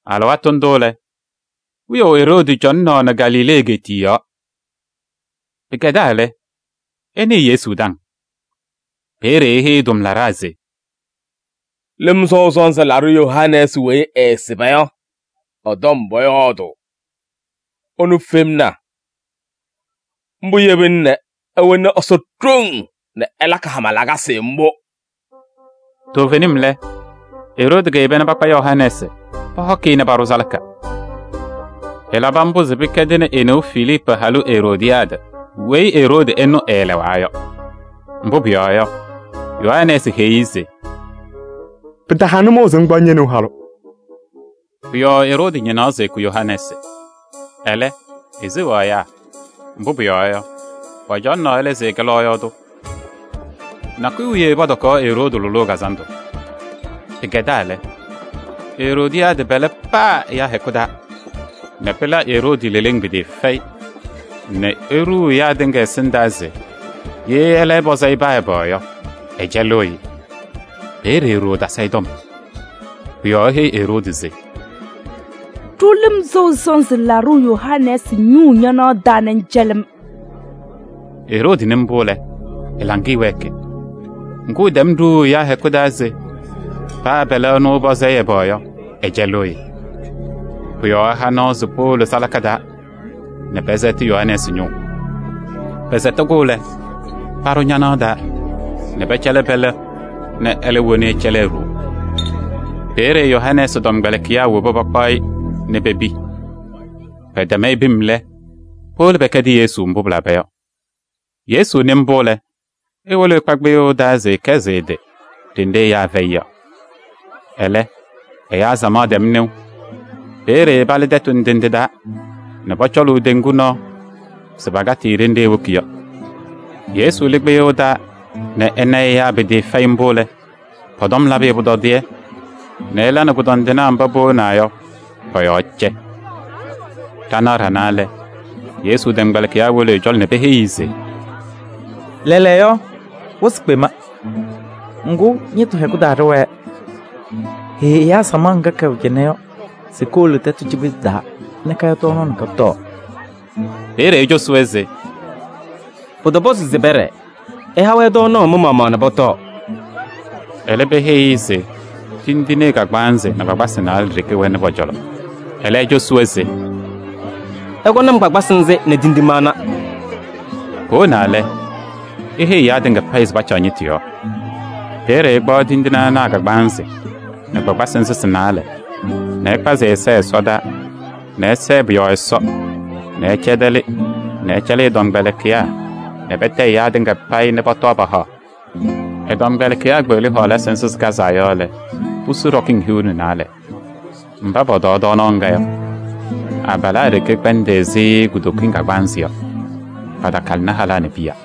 Alɩwaatʋ ndʋ lɛ, wiyaʋ Eroodi cɔŋaɣnɩ Galilee egeetiye yɔɔ. Pɩkɛdaa lɛ, ɛnɩɩ Yesu taŋ. Peeye eheyi ɛ-tʋmlaɖaa se: “Lɩm Sɔʋ Sɔnzɩ Laɖʋ Yohanɛɛsɩ weyi ɛɛsɩba yɔ, ɛ-tɔm pɔyɔɔdʋʋ, ɛnʋ femna. Mbʋ yebina nɛ ɛwɛnɩ Ɛsɔ ɖoŋ nɛ ɛlakɩ hama lakasɩ mbʋ.” Toovenim lɛ, Eroodi keyeba nɛ pakpa Yohanɛɛsɩ pɔhɔkɩ-ɩ nɛ paɖʋ salaka. Ɛlabɩ mbʋ se pɩkɛdɩnɩ e-neu Filiipu halʋ Eroodiyaadɩ weyi Eroodi ɛnʋ ɛɛlɛɣa yɔ. Mbʋ pʋyɔɔ yɔ, Yohanɛɛsɩ heyi-i se: “Pɩtaha nʋmɔʋ se ŋkpaɣ ñe-neu halʋ.” Pʋ-yɔɔ Eroodi ñɩnaɣ se ɛkʋ Yohanɛɛsɩ. Ɛlɛ, eseɣaɣ ɛyaa, mbʋ pʋyɔɔ yɔ, pɔcɔŋaɣnɩ ɛlɛ se ɛkɛ lɔɔyaɣ tʋ. Nakʋyʋ wiye pɔtɔkaɣ Eroodi lʋlʋʋ kazandʋ. Pɩkɛdaa lɛ, Eroodiyaadɩ pɛlɛ paa ɛyaa hɛkʋ taa nɛ pɩla Eroodi leleŋ pɩtɩɩfɛyɩ nɛ eɖuu ɛyaa tɩŋa ɛsɩndaa se ye ɛlɛ ɛpɔzɩ-ɩ paa ɛbɛ yɔ, ɛcɛlɩɣ-ɩ. Peeye e-ɖoo tasɩ-ɩ tɔm. Pʋ-yɔɔ eheyi Eroodi se: “Ɖʋ Lɩm Sɔʋ Sɔnzɩ Laɖʋ Yohanɛɛsɩ ñʋʋ ñanaɣ taa nɛ ŋcɛlɩ-m.” Eroodi nɩ mbʋ lɛ, ɛ-laŋɩyɛ wɛɛkɩ. Ŋgʋ, ɛtɛm ɖuuu ɛyaa hɛkʋ taa se paa pɛlɛ ɛnʋ ɛpɔzɩ-ɩ ɛbɛ yɔ, ɛcɛlɩɣ-ɩ. Pʋ-yɔɔ ɛha nɔɔ se powolo salaka taa nɛ pɛsɛtɩ Yohanɛɛsɩ ñʋʋ. Pɛsɛtɩ-kʋ lɛ, paɖʋ ñanaɣ taa nɛ pɛcɛlɩ pɛlɛ nɛ ɛlɛ woni ɛcɛlɩ e-ɖoo. Peeye Yohanɛɛsɩ tɔmkpɛlɩkɩyaa wobi pakpaɣ-ɩ nɛ pepi. Pɛtɛm-ɩ pim lɛ, powolo pɛkɛdɩ Yesu mbʋ pɩlaba yɔ. Yesu nɩ mbʋ lɛ, ewolo ɛkpa kpɩyʋʋ taa se ɛkɛsɩ ɛ-tɩ ɖenɖe ɛyaa fɛyɩ yɔ. Ɛlɛ, ɛyaa samaɣ tɛm nɩʋ. Peeye palɩ tɛtʋ ndɩ ndɩ taa nɛ pɔcɔlʋʋ teŋgu nɔɔ se pakatɩ-ɩ ɖenɖe ewoki yɔ. Yesu lɩ kpɩyʋʋ taa nɛ ɛna ɛyaa pɩtɩɩfɛyɩ mbʋ lɛ, pɔ-tɔm labɩ-ɩ pʋtɔdɩyɛ nɛ ɛla nɛ kʋdɔndɩnaa mba powonaa yɔ, pɔ-yɔɔ cɛ. Ɖanaɣ ɖanaa lɛ, Yesu tɔmkpɛlɩkɩyaa wolo ɛ-cɔlɔ nɛ peheyi-i se: “Lɛɛlɛɛyɔ, wɩsɩ kpema. Ŋgʋ, ñɩtʋ hɛkʋ taa ɖɩwɛɛ. Heyi ɛyaa samaɣ ŋga kɛwɛ cɩnɛ yɔ se kowolo tɛtʋ cikpetu taa nɛ kaya tɔɔnaɣ nɛ kɔtɔɔ.” Peeye ecosi-wɛ se: “Pɩtɔpɔzɩ se pɛɖɛɛ. Ɩha-wɛ tɔɔnaɣ mɩ-maɣmaɣ nɛ pɔtɔɔ.” Ɛlɛ peheyi-i se tindine kagbaanzɩ nɛ kpakpasɩ naalɛ ɖeke wɛnɩ pɔ-cɔlɔ. Ɛlɛ cosi-wɛ se: “Ɩkɔnɩ-m kpakpasɩ nzɩ nɛ tindine ana.” Powonaa lɛ, eheyi ɛyaa tɩŋa payɩ se pacaɣ ñɩtʋ yɔɔ. Peeye ɛkpaɣ tindine ana a-kagbaanzɩ nɛ kpakpasɩ nzɩ sɩ-naalɛ nɛ ɛkpazɩ ɛ-ɛza ɛsɔdaa nɛ ɛsɛɛ pʋ-yɔɔ Ɛsɔ nɛ ɛcɛdɛlɩ nɛ ɛcɛlɩ ɛ-tɔmkpɛlɩkɩyaa nɛ patayɩ ɛyaa tɩŋa payɩ nɛ pɔtɔɔ pahaɣ. Ɛ-tɔmkpɛlɩkɩyaa kpeɣli hɔɔlasɩ nzɩ sɩkazaa yɔ lɛ, pusu ɖɔkɩŋ hiu nɛ naalɛ. Mba pɔtɔɔ tɔɔnaɣ ŋga yɔ, abalaa ɖeke kɛkpɛndɩ ɛzɩ kutokiŋ kagbaanzɩ yɔ. Patakalɩnɩ halaa nɛ piya.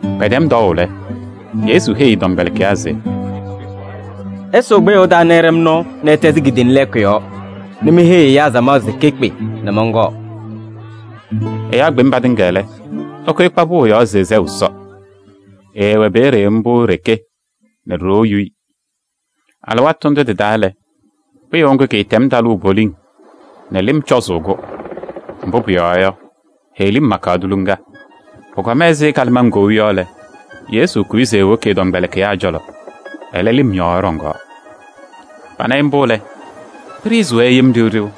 Pɛtɛm tɔɔʋ lɛ, Yesu heyi ɛ-tɔmkpɛlɩkɩyaa se: “Ɩsʋʋ kpɩyʋʋ taa nɛ ɩɖɛ-m nɔɔ nɛ ɩtɛzɩ kidiiliŋ lɛɛkʋ yɔɔ nɛ meheyi ɛyaa samaɣ se kekpe nɛ mɔnkɔɔ.” Ɛyaa kpem patɩŋa lɛ, ɛkʋyɩ ɛkpa pʋʋ yɔɔ se ɛsɛɣ Ɛsɔ. Ɛɛwɛ peeye mbʋ e-ɖeke nɛ ɖoo yu-i. Alɩwaatʋ ndʋ tɩ-taa lɛ, kpɩyʋʋ ŋgʋ kɩtɛm talʋʋ poliŋ nɛ lɩm cɔzʋʋ-kʋ, mbʋ pʋyɔɔ yɔ, heɣlim makaɣ tuliŋa. Pʋkɔma ɛzɩ kalɩmaŋ kou yɔ lɛ, Yesu kʋyɩ se ewoki ɛ-tɔmkpɛlɩkɩyaa cɔlɔ, ɛlɛ, lɩm yɔɔ ɛɖɔŋaɣ. Pana-ɩ mbʋ lɛ, pɩɖɩɣzɩ-wɛ yem ɖɩɣ ɖɩɣ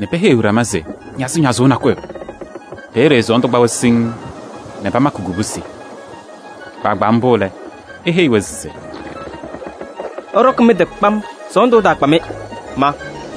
nɛ peheyiɣ ɖama se ñazɩñazʋʋ nakʋyʋ! Peeye sɔɔndʋ kpa-wɛ siŋŋ nɛ pamakɩ kubusi. Kpaagbaa mbʋ lɛ, eheyi-wɛ se: “Ɩɖɔkɩ mɩ-tɩ kpam, sɔɔndʋ ɛtaakpa-mɩ, ma.”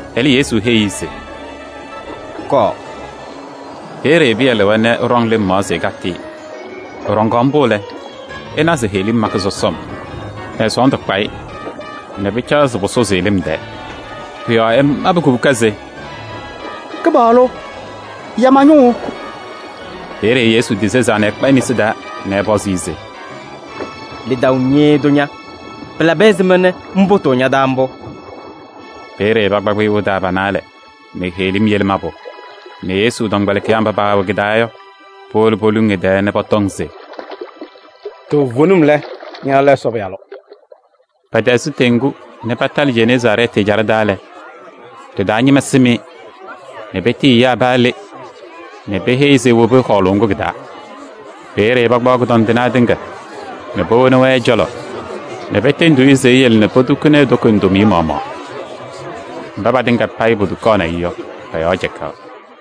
Ɛlɛ, Yesu heyi-i se: “Kɔɔ!” Peeye Pɩyɛ lɩwa nɛ ɛɖɔŋ lɩm yɔɔ se ɛkatɩ-ɩ. Ɛɖɔŋaɣ mbʋ lɛ, ɛna se heɣlim makɩ sɔsɔm nɛ sɔɔndʋ kpa-ɩ nɛ pɩcaɣ se pʋsʋzɩ-ɩ lɩm tɛɛ. Pʋ-yɔɔ ɛmabɩ kubuka se: “Kɩpaɣlʋ! Ya ma-ñʋʋ!” Peeye Yesu tisezaa ɛkpa e-nesi taa nɛ ɛpɔzɩ-ɩ se: “Lidaʋ ñɩɩɩ tʋ ña! Pɩlabɩ ɛzɩma nɛ ŋpʋtʋʋ ña-taa mbʋ?” Peeye pakpa kpɩyʋʋ taa pa-naalɛ nɛ heɣlim yele mabʋ nɛ Yesu tɔmkpɛlɩkɩyaa mba paawɛ kɩ-taa yɔ, powolo poluŋ ɛ-tɛɛ nɛ pɔtɔŋ se: “Toovenim lɛ, ña lɛ Ɛsɔ Pɩyalʋ!” Pɛtɛzɩ teŋgu nɛ patalɩ Jeneezaarɛɛtɩ ɛjaɖɛ taa lɛ, ɖɩ-taa ñɩma sɩm-ɩ nɛ petiyi ɛyaa paa le nɛ peheyi se ewobi hɔɔlʋʋ ŋgʋ kɩ-taa. Peeye pakpaɣ kʋdɔndɩnaa tɩŋa nɛ powoni-wɛ ɛ-cɔlɔ nɛ petendiɣ-i se eyele nɛ potukuni e-toko ndomiye maɣmaɣ. Mba patɩŋa payɩ potukaɣnɩ-ɩ yɔ, pɔ-yɔɔ cɛkaɣ.